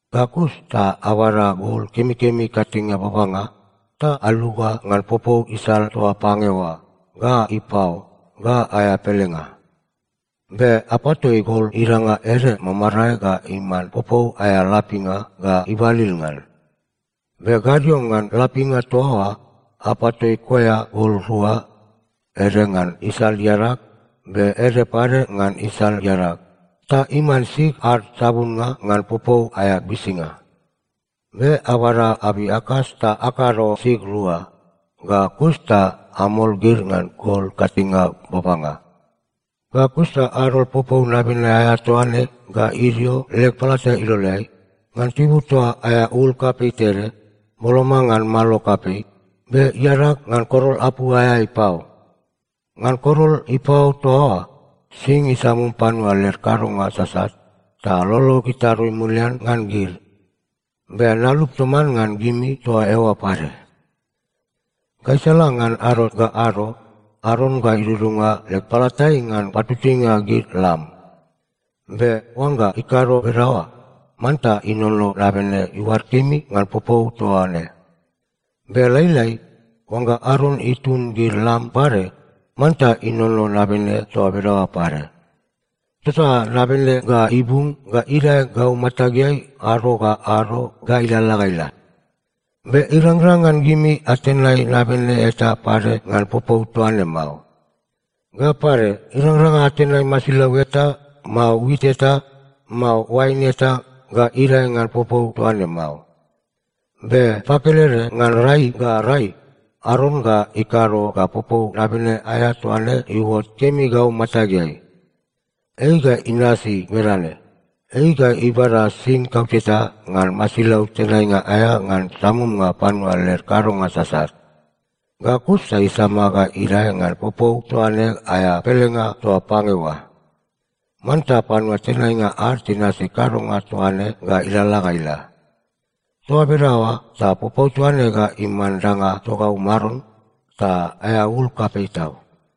Ga kus ta abada gol kemikemi ikatinge babanga, ta aluga ngan popou isal toa pange oa, ga ipao, ga aea pelenga. Be apatoi gol idanga ede mamarae ga iman popou aea lapinga ga ibalil ngan. Be gadio ngan lapinga toa oa, apatoi koea gol rua, ede ngan isal iadag, be ede pade ngan isal iadag, ta iman sig ad sabunnga ngan popou aea bisinga. Be abada abei akas ta akado sig rua, ga kus ta amol gid ngan gol ikatinge babanga. Ga kus ta adol popou nabene aea toa ne ga idio leg palata iloleai, ngan tibur toa aea ul kapei tede, boloma ngan malo kapei, be iadag ngan korol apu aea ipao. Ngan korol ipao toa oa sing isamum panua led kadonga sasat, ta lolog itarui mulian ngan gid. Be nalup toman ngan gimi toa eoa pade. “Gaisala ngan ado ga ado, Aron ga idudunga leg palatai ngan patutuinga gid lam. Be oangga ikado bedaoa, manta inono nabene iuad kemi ngan popou toa ne. Be lailai, oangga Aron itun gid lam pade, manta inono nabene toa bedaoa pade. Tota nabene ga ibung ga idae gau matageai ado ga ado ga ilalala ga ila. Be irangrang ngan gimi atenai nabene eta pade ngan popou toa ne mao. Ga pade, irangrang ngan atenai masilau eta, mao wit eta, mao oain eta ga idae ngan popou toa ne mao. Be pakelede ngan rai ga rai, Aron ga ikado ga popou nabene aea toa ne iuot kemi gau matageai. Ei ga inasi bedane: Ei ga ibada sing kauteta ngan masilau tenainga aea ngan samumnga panua led kadonga sasat. Ga kus ta isama ga idae ngan popou toa ne aea pelenga toa pange oa. Manta panua tenainga ad tinasi kadonga toa ne ga ilalala ga ila. Toa bedaoa ta popou toa ne ga iman danga togau Maron, ta aea ul kapei tau.”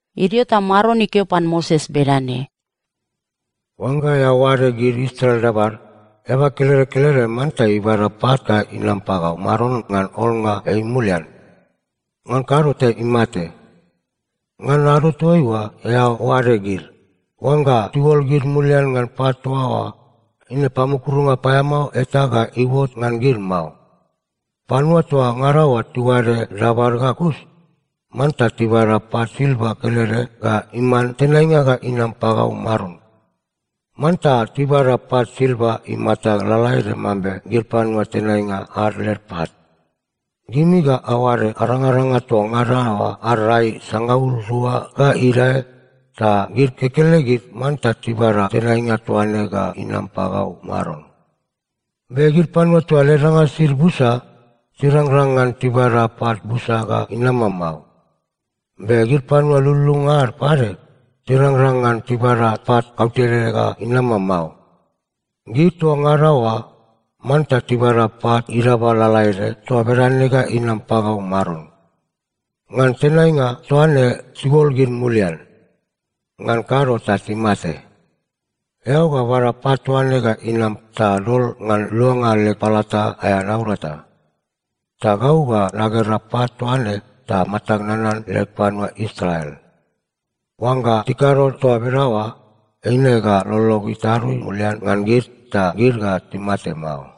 Idio ta Maron ikeo pan Moses bedane, “Oangga eao oade gid Israel dabad, eaba kelede kelede manta ibada pat ga inam pagau Maron ngan olnga ei mulian. Ngan kado ta imate. Ngan ado toaiua eao oade gid, oangga tiuol gid mulian ngan pat toa oa, eine pamukurunga paeamao eta ga iuot ngan gid mao. Panua toa ngada oa tiuade dabad ga kus, manta tibada pat silva kelede ga iman tenainga ga inam pagau Maron. Manta tibada pat silva imata lalaede mambe gid panua tenainga ad led pat. Gimi ga aoade arangaranga toa ngada oa ad rai sangaul rua ga idae, ta gid kekelegid manta tibada tenainga toa ne ga inam pagau Maron. Be gid panua toa led danga sisid busa tirangrang ngan tibada pat busa ga inama mao. Be gid panua lululunga ad pade, tirangrang ngan tibada pat kautede ga inama mao. Gid toa ngada oa manta tibada pat idaba lalaede toa bedane ga inam pagau Maron. Ngan tenainga toa ne tiuol gid mulian. Ngan kado ta timate. Eao ga bada pat toa ne ga inam ta dol ngan luanga leg palata aea naurata. Ta gau ga nagera pat toa ne ta matag nanan leg panua Israel. Oangga tikado toa bedaoa, eine ga lolog itarui mulian ngan gid, ta gid ga timate mao.”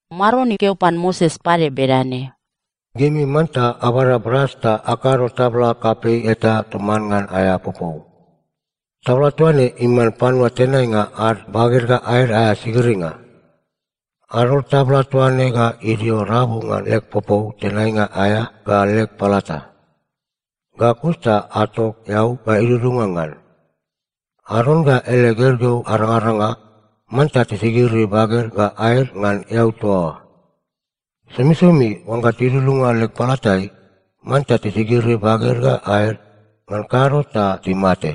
Maron ikeo pan Moses pade bedane, “Gimi manta abada bras ta akado tabla kapei eta toman ngan aea popou. Tabla toa ne iman panua tenainga ad baged ga aed aea sigiringa. Adol tabla toa ne ga idio rabu ngan leg popou tenainga aea ga leg palata. Ga kus ta atok eau ga idudunga ngan. Aron ga ele gergeu arangaranga manta tisigiri baged ga aed ngan eau toa oa. Somisomi oangga tidudunga leg palatai, manta tisigiri baged ga aed, ngan kado ta timate.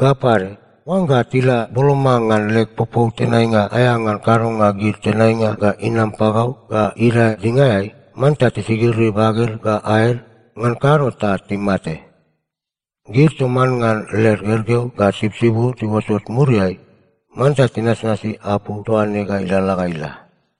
Ga pade, oangga tila boloma ngan leg popou tenainga aea ngan kadonga gid tenainga ga inam pagau ga idae dingaeai, manta tisigiri baged ga aed, ngan kado ta timate. Gid toman ngan led gergeu ga tibutibud tiuotot muriai, manta tinasnasi apu toa ne ga ilalala ga ila.”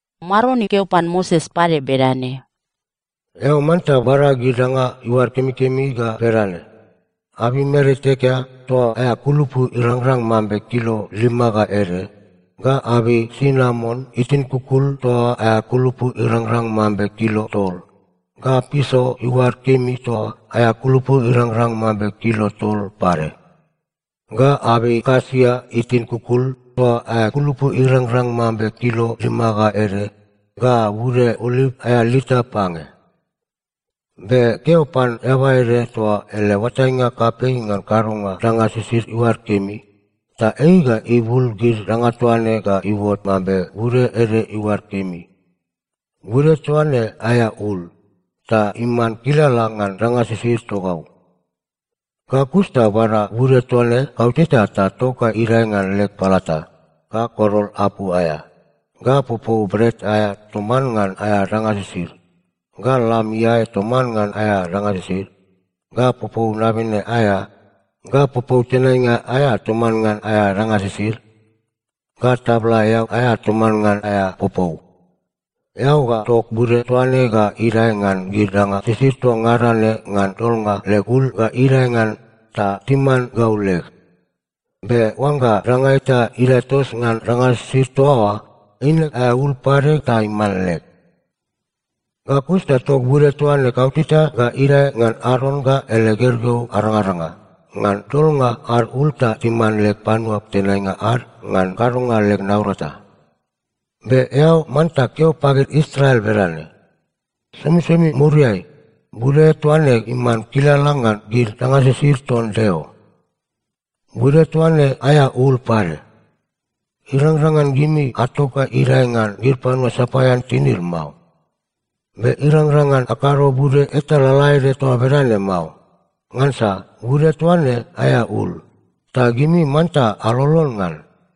Maron ikeo pan Moses pade bedane, “Eao manta bada gid danga iuad kemikemi ga bedane: abei mer itekea toa aea kulupu irangrang mambe kilo lima ga ede, ga abei sinamon itin kukul toa aea kulupu irangrang mambe kilo tol, ga piso iuad kemi toa aea kulupu irangrang mambe kilo tol pade, ga abei kasia itin kukul toa aea kulupu irangrang mambe kilo lima ga ede, ga bude oliv aea lita pange. Be keo pan eaba ede toa ele oatainga kapei ngan kadonga danga sisid iuad kemi, ta ei ga ibul gid danga toa ne ga iuot mambe bude ede iuad kemi. Bude toa ne aea ul, ta iman kilala ngan danga sisid togau. Ga kus ta bada bude toa ne kauteta ta tok ga idae ngan leg palata, ga korol apu aea, ga popou bret aea toman ngan aea danga sisid, ga lam iae toman ngan aea danga sisid, ga popou nabene aea, ga popou tenainga aea toman ngan aea danga sisid, ga tabla eau aea toman ngan aea popou. Eao ga tok bude toa ne ga idae ngan gid danga sisid toa ngada ne ngan dolnga leg ul ga idae ngan ta timan gau leg. Be oangga danga eta idae tos ngan danga sisid toa oa, eine aea ul pade ta iman leg. “Ga kus ta tok bude toa ne kauteta ga idae ngan Aron ga ele gergeu arangaranga, ngan dolnga ad ul ta timan leg panua tenainga ad ngan kadonga leg naurata. Be eao manta keo pagid Israel bedane, ‘Somisomi muriai, bude toa ne iman kilala ngan gid danga sisid ton Deo. Bude toa ne aea ul pade. Irangrang ngan gimi atok ga idae ngan gid panua sapaean tinid mao. Be irangrang ngan akado bude eta lalaede toa bedane mao, ngansa bude toa ne aea ul. Ta gimi manta alolon ngan.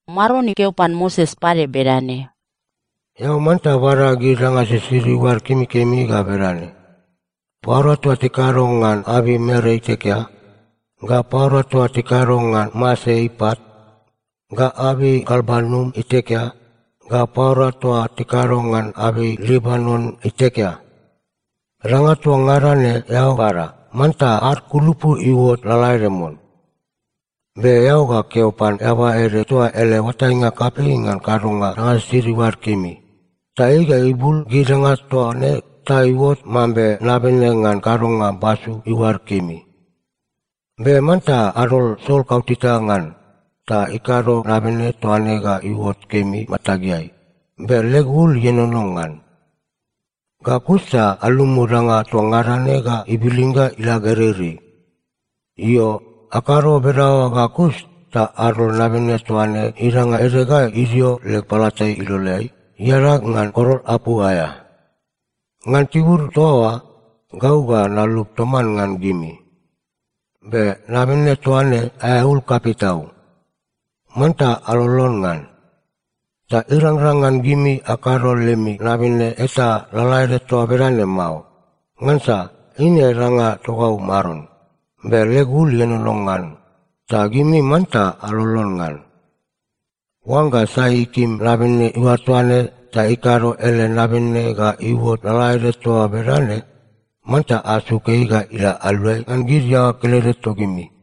Maron ikeo pan Moses pade bedane, “Eao manta bada gid danga sisid iuad kemikemi ga bedane: paura toa tikado ngan abei mer itekea, ga paura toa tikado ngan mase ipat, ga abei galbanum itekea, ga paura toa tikado ngan abei libanon itekea. Danga toa ngada ne eao bada, manta ad kulupu iuot lalaede mon. Be eao ga keo pan eaba ede toa ele oatainga kapei ngan kadonga danga sisid iuad kemi, ta ei ga ibul gid danga toa ne ta iuot mambe nabene ngan kadonga basu iuad kemi. Be manta adol sol kauteta ngan, ta ikado nabene toa ne ga iuot kemi matageai, be leg ul ienono ngan. Ga kus ta alumu danga toa ngada ne ga ibilin ga ila gereirei. Io, akado bedaoa ga kus ta adol nabene toa ne idanga ede ga idio leg palata iloleai, iadag ngan korol apu aea. Ngan tibur toa oa, gau ga nalup toman ngan gimi. Be nabene toa ne aea ul kapei tau. Manta alolon ngan. Ta irangrang ngan gimi akado lemi nabene eta lalaede toa bedane mao. Ngansa eine danga togau Maron, be leg ul ienono ngan, ta gimi manta alolon ngan. Oangga sai ikim nabene iuad toa ne ta ikado ele nabene ga iuot lalaede toa bedane, manta asuk ei ga ila aluai ngan gid iaoa kelede togimi.”